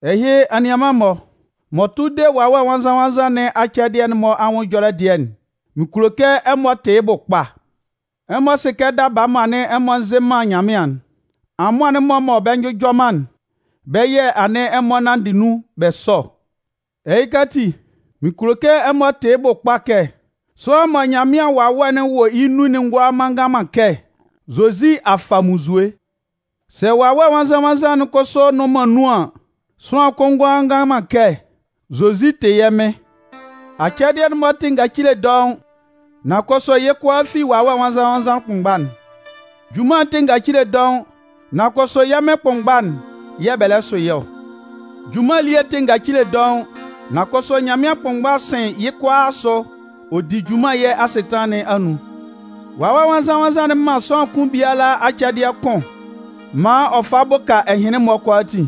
Ɛhɩ, anianman-mɔ, m'ɔ tʋ de Wawɛ Nwannzan-nwannzan nɩn acɛdɩɛ'n-mɔ anwʋn ɛjɔlɛ dɩɛ'n, mɩn kulo kɛ ɛmɔ tɩ yɩ́ bʋ kpa. Ɛmɔ sɩ kɛ daba mɔ anɩn ɛmɔ nzɩ man Nyanmɩan'n, amʋan'n-mɔ mɔ bɛ njʋjɔ man'n, bɛ́ yɛ̂ anɩn ɛmɔ nanndɩ nun bɛ sɔ ɔ. Ɛhɩka ati, mɩn kulo kɛ ɛmɔ tɩ yɩ́ bʋ kpa kɛ, sʋanlan mɔ Nyanmɩan Wawɛ'n wɔ yɩ́ nun'n ngʋala ngan man kɛ: “Zozi a fa munnzue!” Sɛ Wawɛ Nwannzan-nwannzan'n kʋsʋ nnʋn man nun an, sʋanlan kʋn ngʋala ngan man kɛ: “Zozi tɩ yɛ́ Mɩn!” Acɛdɩɛ'n-mɔ tɩ ngacile dɔʋn, nan kʋsʋ yɩ́ kʋalaa fi Wawɛ Nwannzan-nwannzan kʋnmgba'n. Junman'n tɩ ngacile dɔʋn nan kʋsʋ yɛ́ Mɩn kʋnmgba'n yɛ̂ bɛ lɛ sʋ yɩ́ ɔ. Junman elie'n tɩ ngacile dɔʋn nan kʋsʋ Nyanmɩan kʋnmgba'n sɩn yɩ́ kʋalaa asʋ ɔ di junman yɛ́ asɩtanlan nɩn anun. Wawɛ Nwannzan-nwannzan'n man sʋanlan kʋn biala acɛdɩɛ kʋn maan ɔ fa bʋka ɛhɩnlɩn-mɔ kʋalaatin.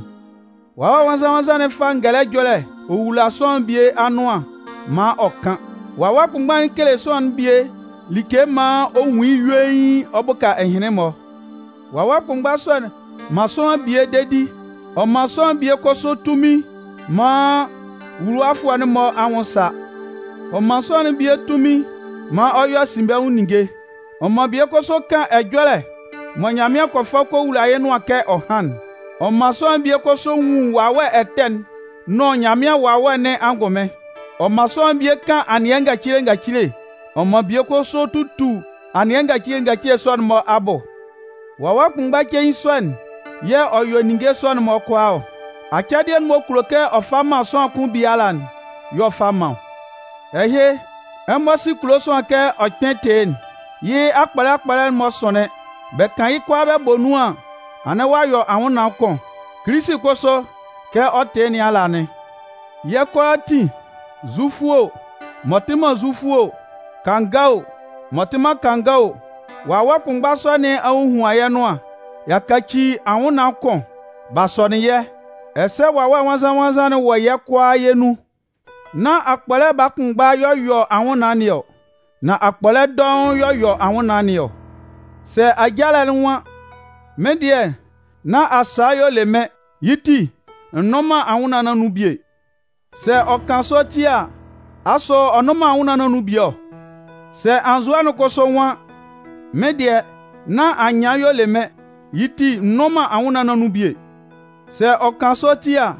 Wawɛ Nwannzan-nwannzan'n fa ngɛlɛ ɛjɔlɛ ɔ wula sʋanlan'n bie anʋan maan ɔ kan. Wawɛ kʋnmgba'n kele sʋanlan'n bie like maan ɔ nwun yɩ́ yuein ɔ bʋka ɛhɩnlɩn-mɔ. Wawɛ kʋnmgba sɔ'n man sʋanlan'n bie dedi. Ɔ man sʋanlan'n bie kʋsʋ tunmin maan nwuluwafʋɛ'n-mɔ anwʋn sa. Ɔ man sʋanlan'n bie tunmin maan ɔ yɔ asinbɛnwʋn ninnge. Ɔ man bie kʋsʋ kan ɛjɔlɛ mɔ Nyanmɩan kɔ fa kɔ wula yɩ́ nʋan kɛ ɔ hán'n. Ɔ man sʋanlan'n bie kʋsʋ nwun wawɛ ɛtɛ'n nʋn Nyanmɩan Wawɛ nɩn angʋnmɩn. Ɔ man sʋanlan'n bie kan anɩɛ ngacile ngacile. Ɔ man bie kʋsʋ tutu anɩɛ ngacile ngacile sɔ'n-mɔ abʋ. Wawɛ kʋnmgba cein sɔ'n yɛ̂ ɔ yɔ ninnge sɔ'n-mɔ kʋalaa ɔ. Acɛdɩɛ m'ɔ kulo kɛ ɔ fa man sʋanlan kʋn biala'n y'ɔ fa man ɔ. Ɛhɩ, ɛmɔ sɩ kulo sʋanlan kɛ ɔ kpɩn tɩ yɩ́'n. Yɩ́ akpɔlɛ akpɔlɛ'n-mɔ sʋnlɩn. Bɛ kan yɩ́ kʋalaa bɛ bɔ nun an, anɩn ɔ yɔ anwʋnnaan kʋn. Kilisi kʋsʋ, kɛ ɔ tɩ yɩ́ nɩn ala anɩn. Yɛ́ kʋalaatin, Zufʋ o, m'ɔ tɩ man Zufʋ o, kanga o, m'ɔ tɩ man kanga o, Wawɛ kʋnmgba sɔ nɩn a hohuan yɛ́ nʋan, y'a kaci anwʋnnaan kʋn, b'a sɔnɩn yɛ́, ɛsɛ Wawɛ Nwannzan-nwannzan'n wɔ yɛ́ kʋalaa yɛ́ nun. Nán akpɔlɛ baa kʋnmgba y'ɔ yɔ anwʋnnaan nɩn ɔ, nan akpɔlɛ dɔʋn y'ɔ yɔ anwʋnnaan nɩn ɔ. Sɛ ajalɛ'n nwan: “Mɩ́n dɩɛ, nán asaa y'ɔ le mɩ́n, yɩ́ ti, n nnʋn man anwʋnnaan nɩn anun bie.” Sɛ ɔ kan sɔ ti a, asʋ ɔ nnʋn man anwʋnnaan nɩn anun bie ɔ? Sɛ anzʋɛ'n kʋsʋ nwan: “Mɩ́n dɩɛ, nán anyɩan y'ɔ le mɩ́n, yɩ́ ti, n nnʋn man anwʋnnaan nɩn anun bie.” Sɛ ɔ kan sɔ ti a,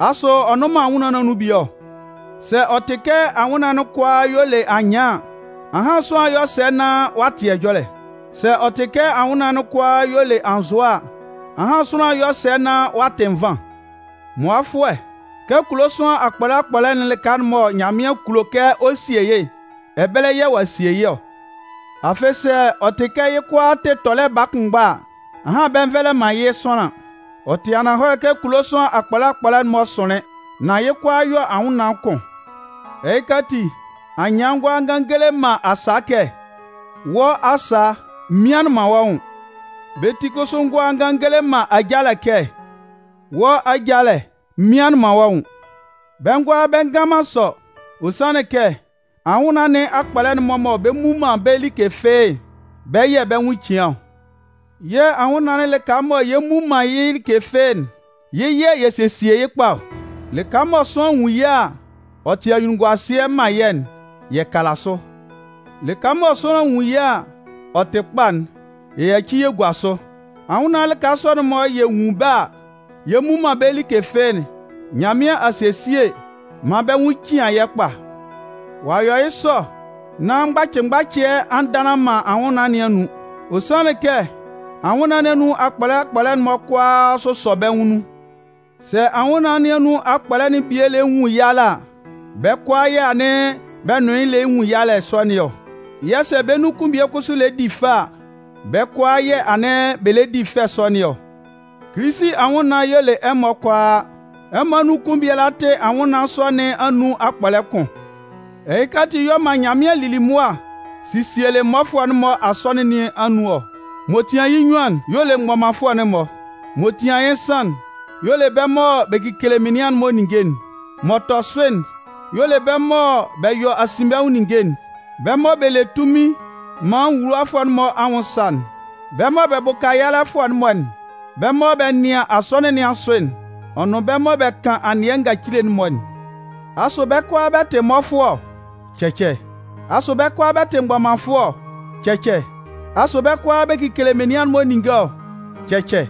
asʋ ɔ nnʋn man anwʋnnaan nɩn anun bie ɔ? Sɛ ɔ tɩ kɛ anwʋnnaan'n kʋalaa y'ɔ le anyɩan an, ahan sʋanlan 'yɔ sɛ nán ɔ'a tɩ ɛjɔlɛ? Sɛ ɔ tɩ kɛ anwʋnnaan'n kʋalaa y'ɔ le anzʋɛ a, ahan sʋanlan 'yɔ sɛ nán ɔ'a tɩ nvan? Mʋafʋɛ, kɛ kulo sʋanlan akpɔlɛ akpɔlɛ'n lɩka mɔ Nyanmɩan kulo kɛ ɔ sie yɩ́'n, ɛbɛlɛ yɛ̂ ɔ'a sie yɩ́ ɔ. Afɩ sɛ ɔ tɩ kɛ yɩ́ kʋalaa tɩ tɔlɛ baa kʋnmgba a, ahan bɛ nvɛlɛ man yɩ́ sʋanlan. Ɔ tɩ ananhɔlɛ kɛ kulo sʋanlan akpɔlɛ akpɔlɛ'n-mɔ sʋnlɩn, nan yɩ́ kʋalaa yɔ anwʋnnaan kʋn. Ɛhɩka ati, anyɩan ngʋala ngan ngele man asaa kɛ: “Wɔ́ asaa, m mianlɩn man wɔ́ nwʋn!” Bɛ́ ti kʋsʋ ngʋala ngan ngele man ajalɛ kɛ: “Wɔ́ ajalɛ, m mianlɩn man wɔ́ nwʋn!” Bɛ ngʋala bɛ ngan man sɔ. Ɔ sanlɩn kɛ anwʋnnaan nɩn akpɔlɛ'n-mɔ mɔ bɛ mmu man bɛ́ like fɩ́ɩ́'n, bɛ́ yɛ̂ bɛ́ nwʋn cian ɔ. Yɛ́ anwʋnnaan'n lɩka mɔ yɛ mmu man yɩ́ like fɩ́ɩ́'n, yɩ́ yɛ̂ yɛ sesie yɩ́ kpa ɔ. Lɩka mɔ sʋanlan nwun yɩ́ a, ɔ tɩ anyunnunguasɩɛ man yɛ́'n, yɛ kala sʋ. Lɩka mɔ sʋanlan nwun yɩ́ a, ɔ tɩ kpa'n, yɛ yaci yɛ gua sʋ. Anwʋnnaan'n lɩka sɔ'n-mɔ yɛ nwun bɛ́ a, yɛ mmu man bɛ́ like fɩ́ɩ́'n, Nyanmɩan a sesie maan bɛ́ nwʋn cian yɛ́ kpa. Ɔ yɔ yɩ́ sɔ nán mgbacɩ mgbacɩɛ a ndanlan man anwʋnnaan nɩn anun. Ɔ sanlɩn kɛ anwʋnnaan nɩn anun akpɔlɛ akpɔlɛ'n-mɔ kʋalaa sʋsɔ bɛ́ nwʋn nun. Sɛ anwʋnnaan nɩn anun akpɔlɛ'n bie lɛ nwun yalɛ a, bɛ́ kʋalaa yɛ́ anɩn bɛ nʋn yɩ́ lɛ nwun yalɛ sɔ nɩn ɔ. Yɛ̂ sɛ bɛ́ nun kʋn bie kʋsʋ lɛ di fɛ a, bɛ́ kʋalaa yɛ̂ anɩn bɛ lɛ di fɛ sɔ nɩn ɔ. Kilisi anwʋnnaan'n y'ɔ le ɛmɔ kʋalaa. Ɛmɔ anun kʋn biala tɩ anwʋnnaan sɔ nɩn anun akpɔlɛ kʋn. Ɛhɩka ati y'ɔ man Nyanmɩan lili mʋa sielɩ mmɔfʋɛ'n-mɔ Asɔnɩn nɩn anun ɔ. M'ɔ tian yɩ́ nnyuan'n y'ɔ le mgbɔmanfʋɛ'n-mɔ. M'ɔ tian yɩ́ nsan'n y'ɔ le bɛ́ mɔ bɛ kekele menian'n-mɔ ninnge'n. M'ɔ tɔ sʋ'n y'ɔ le bɛ́ mɔ bɛ yɔ asinbɛnwʋn ninnge'n, bɛ́ mɔ bɛ le tunmin maan nwuluwafʋɛ'n-mɔ anwʋn sa'n, bɛ́ mɔ bɛ bʋka yalɛfʋɛ'n-mɔ'n, bɛ́ mɔ bɛ nɩan Asɔnɩn nɩn asʋ'n, ɔ nʋn bɛ́ mɔ bɛ kan anɩɛ ngacile'n-mɔ'n. Asʋ bɛ́ kʋalaa bɛ tɩ mmɔfʋɛ ɔ? Cɛcɛ! Asʋ bɛ́ kʋalaa bɛ tɩ mgbɔmanfʋɛ ɔ? Cɛcɛ! Asʋ bɛ́ kʋalaa bɛ kekele menian'n-mɔ ninnge ɔ? Cɛcɛ!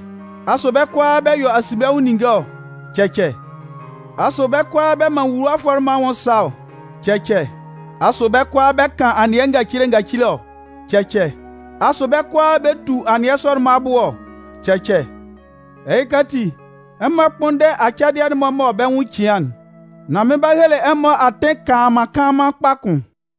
Asʋ bɛ́ kʋalaa bɛ yɔ asinbɛnwʋn ninnge ɔ? Cɛcɛ! Asʋ bɛ́ kʋalaa bɛ man nwuluwafʋɛ'n-mɔ anwʋn sa ɔ? Cɛcɛ! Asʋ bɛ́ kʋalaa bɛ kan anɩɛ ngacile ngacile ɔ? Cɛcɛ! Asʋ bɛ́ kʋalaa bɛ tu anɩɛ sɔ'n-mɔ abʋ ɔ? Cɛcɛ! Ɛhɩka ati, ɛmɔ kpʋ́nndɛ acɛdɩɛ'n-mɔ mɔ bɛ́ nwʋn cian'n. Nan mɩn 'ba hele ɛmɔ atɩn kanlanman kanlanman kpa kʋn.